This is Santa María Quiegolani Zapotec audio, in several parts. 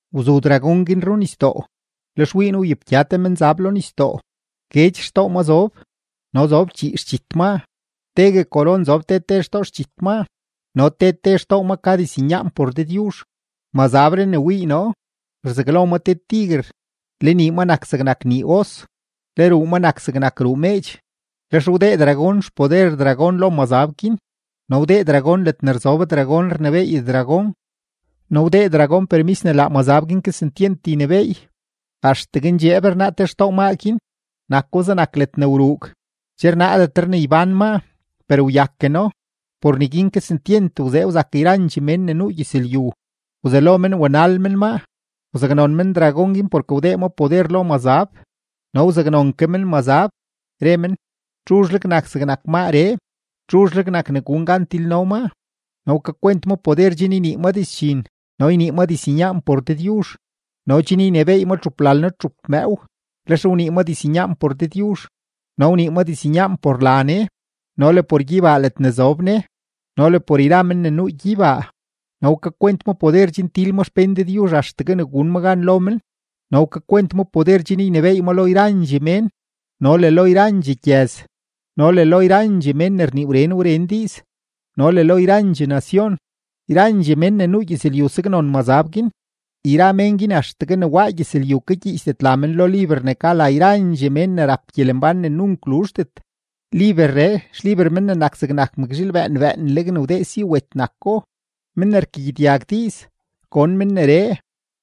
Wzu dragón guin runisdoo; lex wii noo wyepgya te mazab lo nisdoo; guedx xtoo ma zob no zob chii xdxit maa; tegue koron zob te te xtoo xdxit maa, no te te xtoo maa ka diznyaan por Dëdyuzh. Mazabree ne wii noo, rzaglo ma te tiguer, le nii ma nak zegnak nii os, le ruu ma nak zegnak ruu meedx. Lex wdee dragón xpoder dragón lo mazab guin no wdee dragón ledne rzob dragón rnebééy dragón no wdee dragón permis ne laa mazab guin kesentyent ynebééy. Axtegue ndxeeb rnaa te xtoo maa guin, nako zegnak ledne wruug, che rnaadetre ne ybán maa, per wyakeno; por neguin kesentyent wzee wzak yrandxee mén ne nuu gyëzlyu, wzelo men wanal men maa. Wzaknon men dragón guin porke wdee ma poder lo mazab no wzaknon ke men mazab, re men: ―¿Txuzhleg nak zegnak maaree? ¿Txuzhleg nak ne gun gan tilno maa? No wkakwent ma poder chen ynii ma dizdxin no ynii ma diznyaan por Dëdyuzh no chen ynebééy ma txuplalno-txup mëëw. Lex wnii ma diznyaan por Dëdyuzh no wnii ma diznyaan por la Ne no le por gyeybaa ledne zob Ne no le por yra men ne nuu gyeybaa. No wkakwent ma poder chen til ma xpén Dëdyuzh axtegue ne gun ma gan lo men, no wkakwent ma poder chen ynebééy ma lo yralondxee mén, no le lo yrandxee gyëz, no le lo yrandxee mén ne rnii wren wren diiz, no le lo yrandxee nacion. Yrandxee mén ne nuu gyëzlyu saknon mazab guin, yra mén guin axtegue ne waa gyëzlyu kagyiichdet la men lo liber ne ka la yrandxee mén ne rap gyelembán ne nunk luzhdet; liberree xliber Men ne nak zegnak mëkzhiil bëën bëënleg ne wdee si wet nako. Men ne rkagyedyag diiz, gon men neree.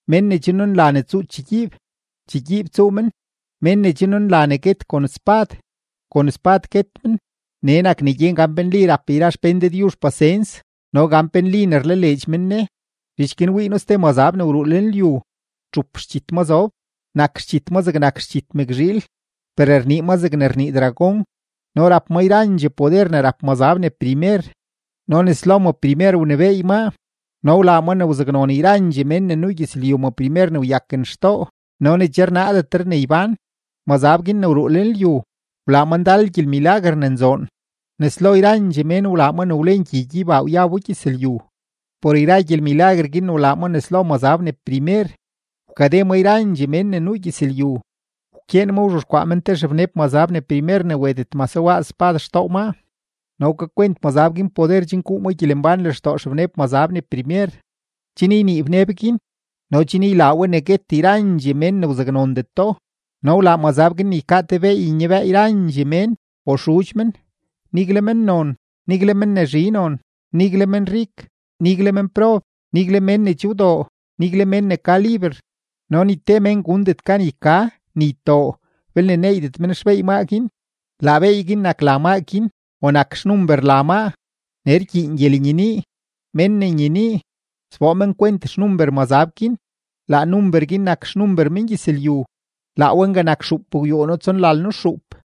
Mén ne che nunla ne tsuu chegyiib, chegyiib tsuu men; mén ne che nunla ne guet kon spad, kon spad guet men. Nee nak ne gyen gan pe nli ne rap yra xpén Dëdyuzh pasens no gan pe nli ne rlaleedx men Ne. Zhich guin wii noo ste mazab ne wruu lenlyu; txup xdxit ma zob, nak xdxit ma zegnak xdxit mëkzhiil, per rnii ma zegne rnii dragón. No rap ma yrandxee poder ne rap mazab ne primer no nes lo ma primer wnebééy maa, no wlaa ma ne wzaknon yrandxee mén ne nuu gyëzlyu ma primer ne wyaken xtoo no ne che rnaadetre ne ybán. Mazab guin ne wruu lenlyu, wlaa ma ndal gyelmilaguer ne nzoon, nes lo yrandxee mén wlaa ma ne wlen gyi gyeybaa wyabo gyëzlyu. Por yra gyelmilaguer guin ne wlaa ma nes lo mazab ne primer, wkade ma yrandxee mén ne nuu gyëzlyu. Wkyeen ma wzhexkwaa men te xebneb mazab ne primer ne wetet mase waaz spad xtoo maa. No wkakwent mazab guin poder chen guu ma gyelembán lextoo xebneb mazab ne primer, chen ynii bneb guin no chen ylaa we ne guet yrandxee mén ne wzaknondeto. No wlaa mazab guin ne ykaa te beey nyabëë yrandxee mén o xudx men, nigle mennon, nigle men ne zhi non, nigle menrik, nigle menprob, nigle mén ne che wdoo, nigle mén ne ka liber. No ni te mén gundet gan yka ni ytoo belne neeydet men xbeey maa guin. Laa beey guin nak la maa guin o nak xnumber la maa. Nee rkyiin gyelenyenii. Mén ne nyenii, sboo men kwent xnumber mazab guin; laa number guin nak xnumber mengyëzlyu; laa we nga nak xuupgwyuuno-tsonlalno-xuup.